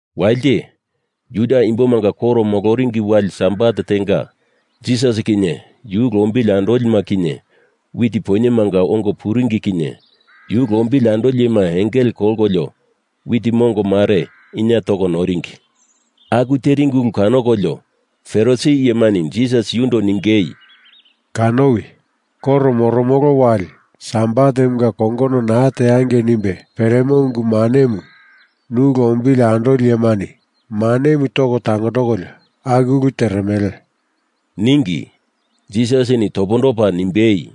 Walite, Juda imbomanga koro moloringi wali Sabat tenga, Jisas kinye yu lombili andolima kinye wit poinyemanga ongo puringi kinye yu lombili andoli iyema engele kolkolio wit mongo mare inie toko noringi. Aku teringi ulu kanokolio Farisi iyemani Jisas yundo ningei, “Kanowi! Koro moromolo wali sabatemunga kongono naa teangei nimbe peremo ungu manemu nu lombili andoli iyemani manemu topa tangondokolio aku ulu teremele,” ningi. Jisasini topondopa nimbei,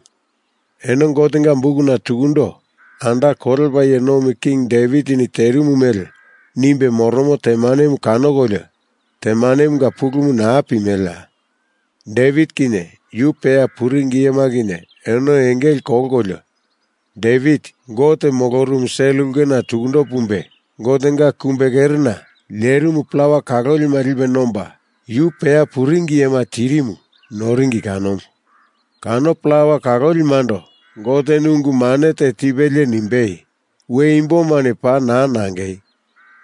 “Eno Gotenga bukuna tukundo anda kolepa iye nomi king Devitini terimu mele nimbe moromo temanemu kanokolio temanemunga pulumu naa pimeleya? Devit kinye yu peya puringi iyema kinye eno engele kolkolio, Devit Gote molorumu sel ulkena tukundo pumbe, Gotenga kumbe kerena lerimu plawa kalolima lipe nomba, yu peya puringi iyema tirimu noringi kanomu. Kano plawa kalolimando Goteni ungu mane te tipelie nimbei, ‘We imbomani paa naa nangei!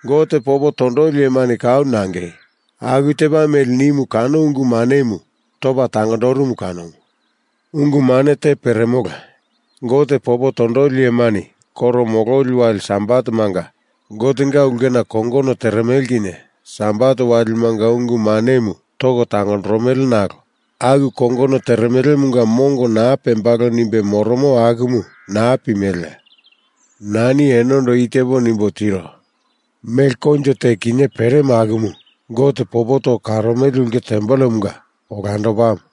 Gote popo tondoli iyema kau nangei,’ aku tepa mele nimu kano ungu manemu topa tangondorumu kanomu. Ungu mane te peremola. Gote popo tondoli iyemani koro mololi wali Sabatemanga Gotenga ulkena kongono teremele kinye sabat walimanga ungu manemu toko tangondoromele nalo aku kongono teremelemunga mongo naa pembalo nimbe moromo akumu naa pimeleya? Nani enondo i tepo nimbo tiro. Mele koinjo te kinye peremo akumu Gote popo toko karomele ulke tempelemunga olandopamu.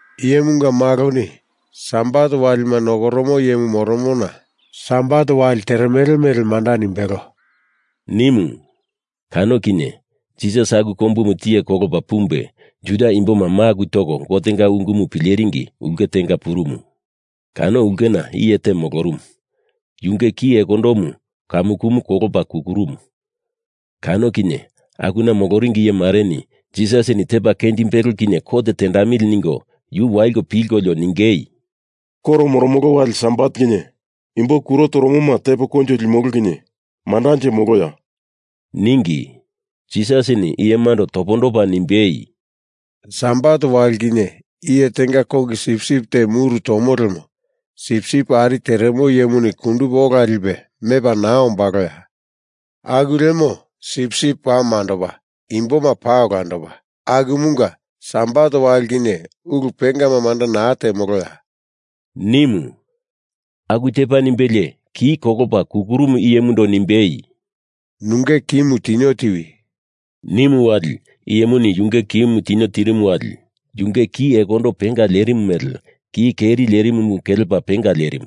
Iyemunga Maloni Sabat walima nokoromo iyemu moromona Sabat wali teremele mele manda nimbelo,” nimu. Kano kinye Jisas aku kombumu tiye kolopa pumbe Juda imboma maku toko Gotenga ungumu pileringi ulke tenga purumu. Kano ulkena iye te molorumu, yunge ki ekondomu kamukumu kolopa kukurumu. Kano kinye akuna moloringi iye mareni Jisasini tepa kenjimbelo kinye kot tendamili ningo yu waliko pilkolio ningei, “Koro moromolo wali Sabat kinye imbo kuro toromoma tepo koinjo limolo kinye mandanje moloya?” ningi. Jisasini iyemando topondopa nimbei, “Sabat wali kinye iye tenga kongi sipsip te muru tomo lemo sipsip ari teremo iyemuni kundupe ola lipe mepa naa ombaloya? Aku lemo sipsip paa mandopa, imboma paa olandopa, akumunga Sabat wali kinye ulu pengama manda naa temoloya?” nimu. Aku tepa nimbelie ki kolopa kukurumu iyemundo nimbei, “Nunge kimu tinio tiwi,” nimu wali iyemuni yunge kimu tinio tirimu wali yunge ki ekondo penga lerimu mele ki keri lerimumu kelepa penga lerimu.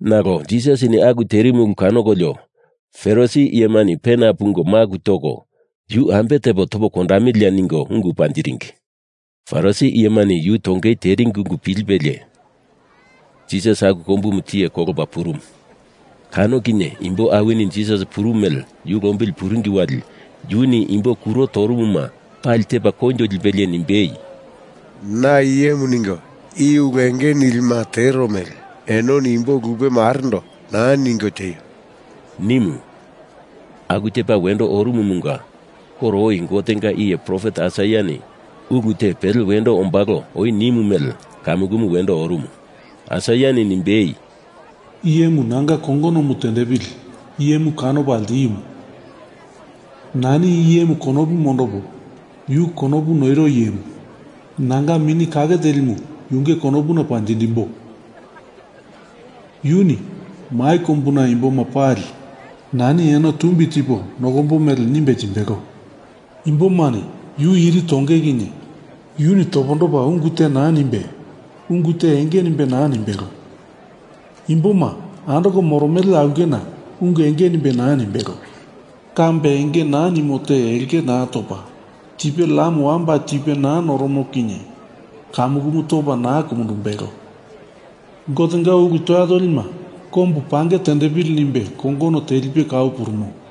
Nalo Jisasini aku terimu ulu kanokolio Farisi iyemani pena pungo maku toko Yu ambe tepo topo kondamiliya ningo ungu panjiringi. Farisi iyemani yu tongei teringi ungu pilipelie Jisas aku kombumu tiye kolopa purumu. Kano kinye imbo awini Jisas purumu mele yu lombili puringi wali yuni imbo kuro torumuma pali tepa koinjo lipelie nimbei, “Na i iyemu ningo i ulu enge nilima tero mele enoni imbo lupe marendo naa ningo tieio!” nimu. Aku tepa wendo orumumunga koro oi Gotenga iye profet Aisaiani ulu te pele wendo ombalo oi nimu mele kamukumu wendo orumu. Aisaiani nimbei, I iyemu nanga kongonomu tendepili iye kanopa ltiumu. Nani i iyemu konopu mondopo, yu konopu noiro iyemu. Nanga Mini Kake Telimu yunge konopuna panjindimbo. Yuni mai kombuna imboma pali nani eno tumbi tipo nokombo mele nimbe timbelo. Imbomani yu iri tonge kinye yuni topondopa ungu te naa nimbe, ungu te enge nimbe naa nimbelo. Imboma andoko moromele aulkena ungu enge nimbe naa nimbelo. Kambe enge naa nimo te elke naa topa, tipe lam wamba tipe naa noromo kinye kamukumu topa naa kumundumbelo. Gotenga ulu toya tolima kombu pange tendepili nimbe kongono telipe kau purumo.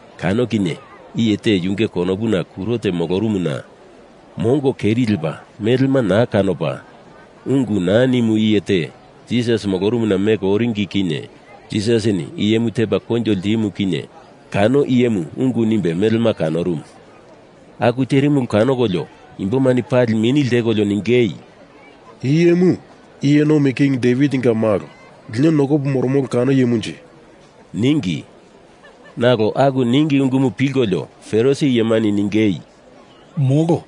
Kano kinye iye te yunge konopuna kuro te molorumuna mongo keri lepa melema naa kanopa ungu naa nimu iye te Jisas molorumuna meko oringi kinye Jisasini iyemu tepa koinjo ltimu kinye kano iyemu ungu nimbe melema kanorumu. Aku terimu ulu kanokolio imbomani pali mini ltekolio ningei, “I iyemu iye nomi king Devitinga malo, lino nokopo moromolo kano iyemunje?” ningi. Nalo aku ningi ungumu pilkolio Farisi iyemani ningei, “Molo.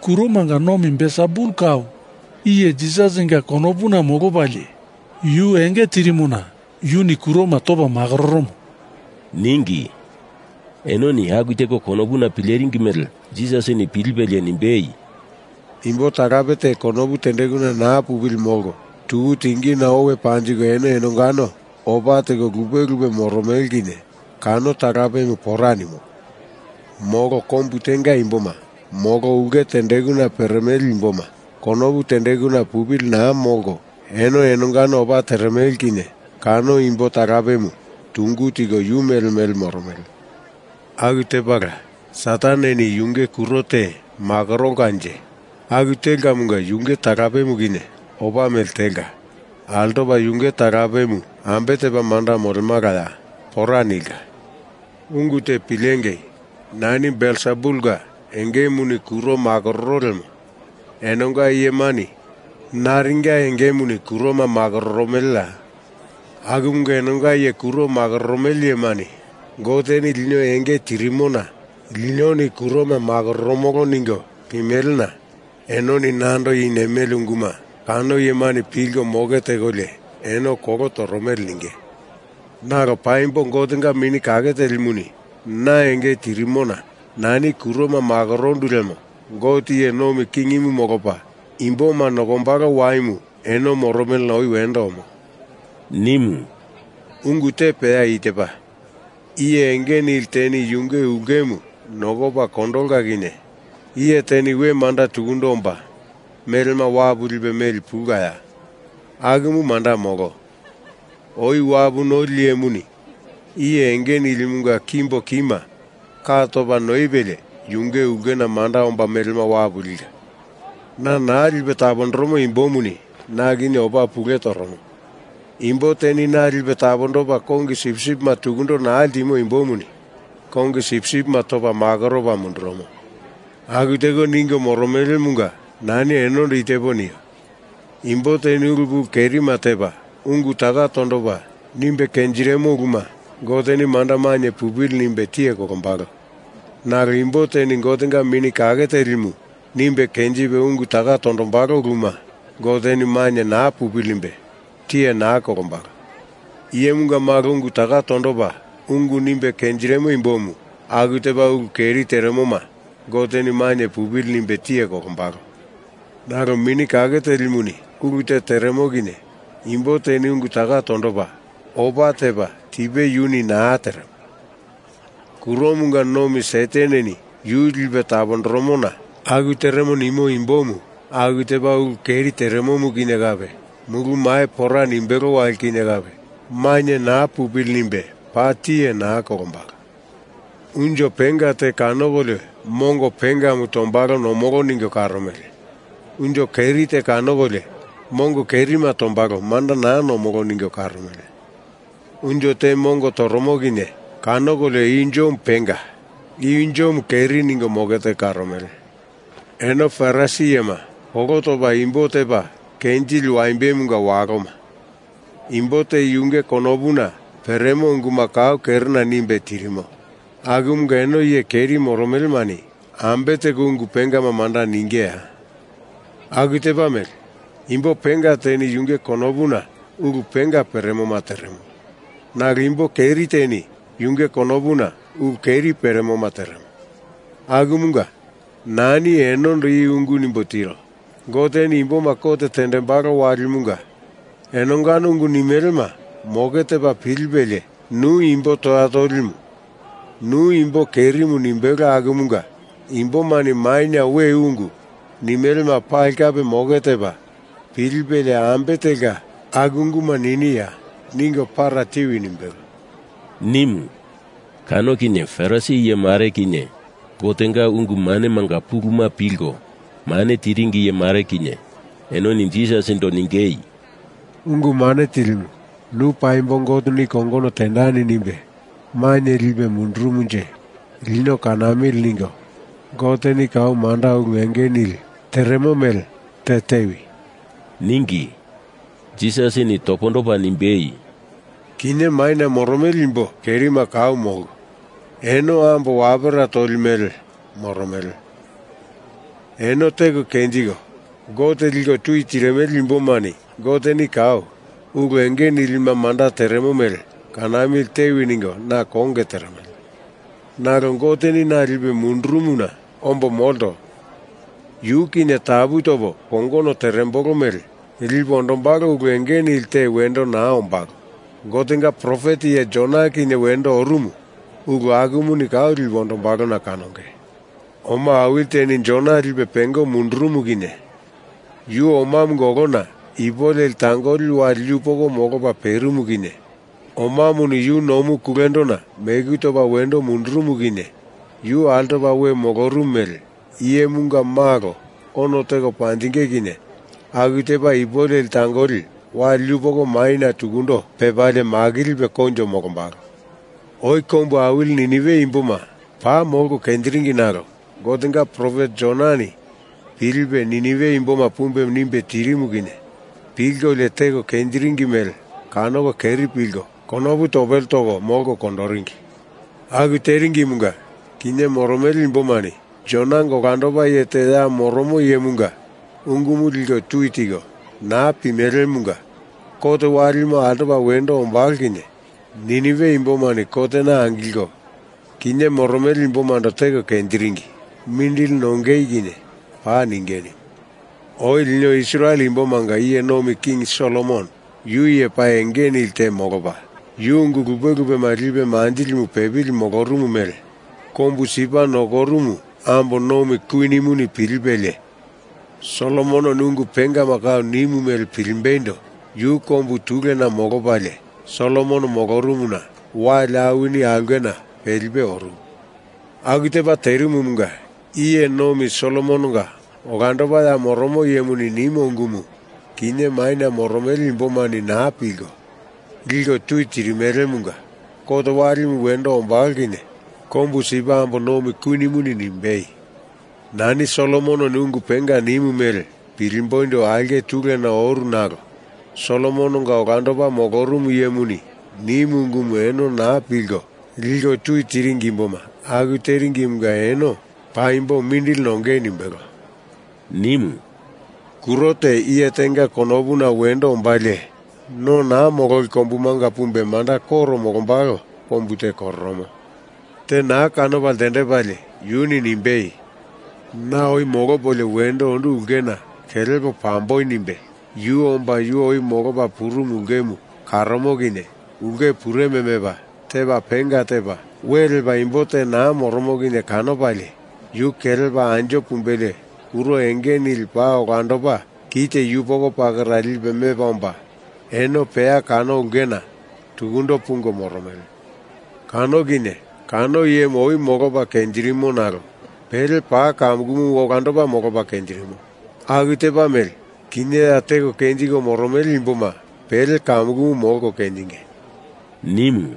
Kuromanga nomi Belsebul kau iye Jisasinga konopuna molopalie yu enge tirimona yuni kuroma topa makororomo,” ningi. Enoni aku teko konopuna pileringi mele Jisasini pilipelie nimbei, “Imbo talape te konopu tendekuna naa pupili molko tuku tingina owe panjiko eno enongano opa teko lupe lupe moromele kinye kano talapemu pora nimo. Molo kombu tenga imboma molo ulke tendekuna peremele imboma konopu tendekuna pupili naa molko eno enongano opa teremele kinye kano imbo talapemu tungu tiko yu mele mele moromele. Aku tepala, Sataneni yunge kuro te makorolkanje aku telkamunga yunge talapemu kinye opa mele telka. Altopa yunge talapemu ambe tepa manda molemalaya? Pora nilka. Ungu te pilengei! Nani Belsebulinga engemuni kuroma makororo lemo enonga iyemani naringa engemuni kuroma makororomeleya? Akumunga enonga iye kuroma makororomele iyemani Goteni lino enge tirimona linoni kuroma makororomolo ningo pimelena enoni nando i nimele unguma kano iyemani pilko moke tekolio eno kolo toromele ninge. Nalo paimbo Gotenga Mini Kake Telimuni na enge tirimona nani kuroma makorondu lemo Gote iye nomi kingimu molopa imboma nokombalo waimu eno moromelena oi wendo omo,” nimu. “Ungu te peya i tepa: Iye enge nili teni yunge ulkemu nokopa kondolka kinye iye teni we manda tukundo omba melema wapu lipe meli pulkaya? Akumu manda molo. Oi wapu noli iyemuni iye enge nilimunga kimbo kima ka topa noipelie yunge ulkena manda omba melema wapu lika. Na naa lipe tapondoromo imbomuni na kinye opa pule toromo. Imbo teni na lipe tapondopa kongi sipsipima tukundo naa ltimo imbomuni kongi sipsipima topa makoropa mundurumo. Aku teko ningo moromelemunga nani enondo i tepo nio. Imbo teni ulu pulu kerima tepa, ungu taka tondopa nimbe kenjirimo uluma Goteni manda mainye pupili nimbe tiye kolombalo. Nalo imbo teni Gotenga Mini Kake Telimu nimbe kenjipe ungu taka tondombalo uluma Goteni mainye naa pupili nimbe tiye naa kolombalo. Iyemunga Malo ungu taka tondopa ungu nimbe kenjirimo imbomu aku tepa ulu keri teremoma Goteni mainye pupili nimbe tiye kolombalo. Nalo Mini Kake Telimuni ulu te teremo kinye imbo teni ungu taka tondopa, opa tepa tipe yuni naa teremo, kuromanga nomi Sataneni yu lipe tapondoromona aku teremo nimo imbomu aku tepa ulu keri teremomu kinye kape mulu mai pora nimbelo wali kinye kape mainye naa pupili nimbe paa tiye naa kolombalo. Unjo penga te kanokolio mongo pengama tombalo nomolo ningo karomele. Unjo keri te kanokolio mongo kerima tombalo manda naa nomolo ningo karomele. Unjo te mongo toromo kinye kanokolio i unjomu penga, i unjomu keri ningo moke teko karomele. Eno Farisi iyema, kolo topa imboma tepa kenjili waimbemunga waloma. Imbo te yunge konopuna peremo unguma kau kerena nimbe tirimo akumunga eno iye keri moromelemani ambe teko ungu pengama manda ningeya? Aku tepa mele, imbo penga teni yunge konopuna ulu penga peremoma teremo, nalo imbo keri teni yunge konopuna ulu keri peremoma teremo. Akumunga nani enondo i ungu nimbo tiro. Goteni imboma kot tendembalo walimunga enongano ungu nimelema moke tepa pilipelie nu imbo toya tolimu, nu imbo kerimu nimbelo akumunga imbomani maina we ungu nimelema pali kape moke tepa pilipelie ambe telka aku unguma niniya, ningo para tiwi nimbelo,” nimu. Kano kinye Farisi iye mare kinye Gotenga ungu manemanga puluma pilko mane tiringi iye mare kinye enoni Jisasindo ningei, “Ungu Mane Tilimu, nu paimbo Goteni kongono tendani nimbe maina lipe mundurumunje lino kanamili ningo Goteni kau manda ulu enge nili teremo mele te tewi,” ningi. Jisasini topondopa nimbei, “Kinye maina moromele imbo kerima kau molko eno ambo wapera toli mele moromele. Eno teko kenjiko Gote liko tui tirimele imbomani Goteni kau ulu enge nilima manda teremo mele kanamili tewi ningo na konge teremele. Nalo Goteni na lipe mundurumuna ombo molto. Yu kinye tapu topo kongono terembolo mele lipe ondombalo ulu enge nili te wendo naa ombalo. Gotenga profet iye Jona kinye wendo orumu ulu akumuni kau lipe ondombalona kanonge. Oma awili teni Jona lipe pengo mundurumu kinye yu omamunga olona ipu leli tangoli wali yupoko molopa perimu kinye omamuni yu nomu kulendona meku topa wendo mundurumu kinye yu altopa we molorumu mele Iyemunga Malo ono teko panjinge kinye aku tepa ipu leli tangoli wali yupoko maina tukundo pepalie makilipe koinjo molombalo. Oi kombu awili Ninive imboma paa molko kenjiringi nalo Gotenga profet Jonani pilipe Ninive imboma pumbe nimbe tirimu kinye pilkolio teko kenjiringi mele kanoko keri pilko konopu topele toko molko kondoringi. Aku teringimunga kinye moromele imbomani Jonanga olandopa iye te ya moromo iyemunga ungumu liko tui tiko naa pimelemunga kot walimu altopa wendo ombalo kinye Ninive imbomani kotena angilko, kinye moromele imbomando teko kenjiringi, mindili nongei kinye paa ninge nimu. Oi lino Israel imbomanga iye nomi king Solomon yu iye paa enge nili te molopa, yu ungu lupe lupema lipe manjindilimu pepili molorumu mele kombu Sipa nokorumu ambo nomi kwinimu pilipelie, Solomononi ungu pengama kau nimu mele pilimbeindo yu kombu tulena molopalie Solomon molorumuna wali awini aulkena pelipe orumu. Aku tepa terimumunga, iye nomi Solomononga olandopa ya moromo iyemuni nimo ungumu, kinye maina moromele imbomani naa pilko, liko tui tirimelemunga kot walimu wendo ombalo kinye kombu Sipa ambo nomi kwinimuni nimbei, ‘Nani Solomononi ungu penga nimu mele pilimboindo aulke tulena oru nalo Solomononga olandopa molorumu iyemuni nimu ungumu eno naa pilko, liko tui tiringi imboma aku teringimunga eno paimbo mindili nongei,’ nimbelo,” nimu. “Kuro te iye tenga konopuna wendo ombalie, no naa mololi kombumanga pumbe manda koro molombalo kombu te kororomo. Te naa kanopa ltendepalie yuni nimbei, ‘Na oi molopolio wendo ondu ulkena kelepo pambo,’ nimbe yu omba yu oi molopa purumu ulkemu karomo kinye ulke pureme mepa tepa penga tepa we lepa imbo te naa moromo kinye kanopalie, yu kelepa anjo pumbelie kuro enge nili paa olandopa kite yupoko pakera lipe mepa omba eno peya kano ulkena tukundo pungo moromele. Kano kinye kano iyemu oi molopa kenjirimo nalo pele paa kamukumu olandopa molopa kenjirimo. Aku tepa mele, kinye ya teko kenjiko moromele imboma pele kamukumu molko kenjinge,” nimu.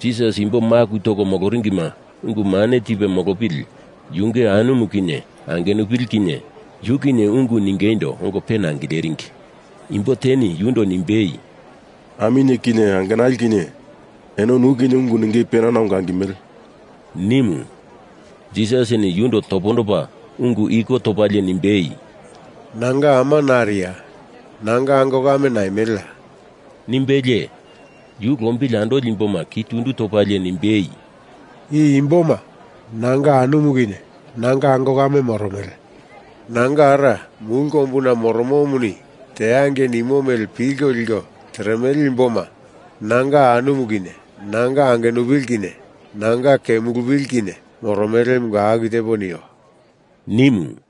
Jisas imbo maku toko moloringima ungu mane tipe molopili yunge anumu kinye angenupili kinye yu kinye ungu ningeindo ongo pena angileringi. Imbo teni yundo nimbei, “Aminye kinye angenali kinye eno nu kinye ungu ningei penana ongo angimele,” nimu. Jisasini yundo topondopa ungu iko topalie nimbei, “Nanga ama nariya? Nanga ango kame naimeleya?” nimbelie, yu lombili andoli imboma ki tundu topalie nimbei, “I imboma nanga anumu kinye nanga ango kame moromele. Nanga Ara, mulu kombuna moromomuni teangei nimo mele pilko liko teremele imboma nanga anumu kinye nanga angenupili kinye nanga kemulupili kinye moromelemunga aku tepo nio,” nimu.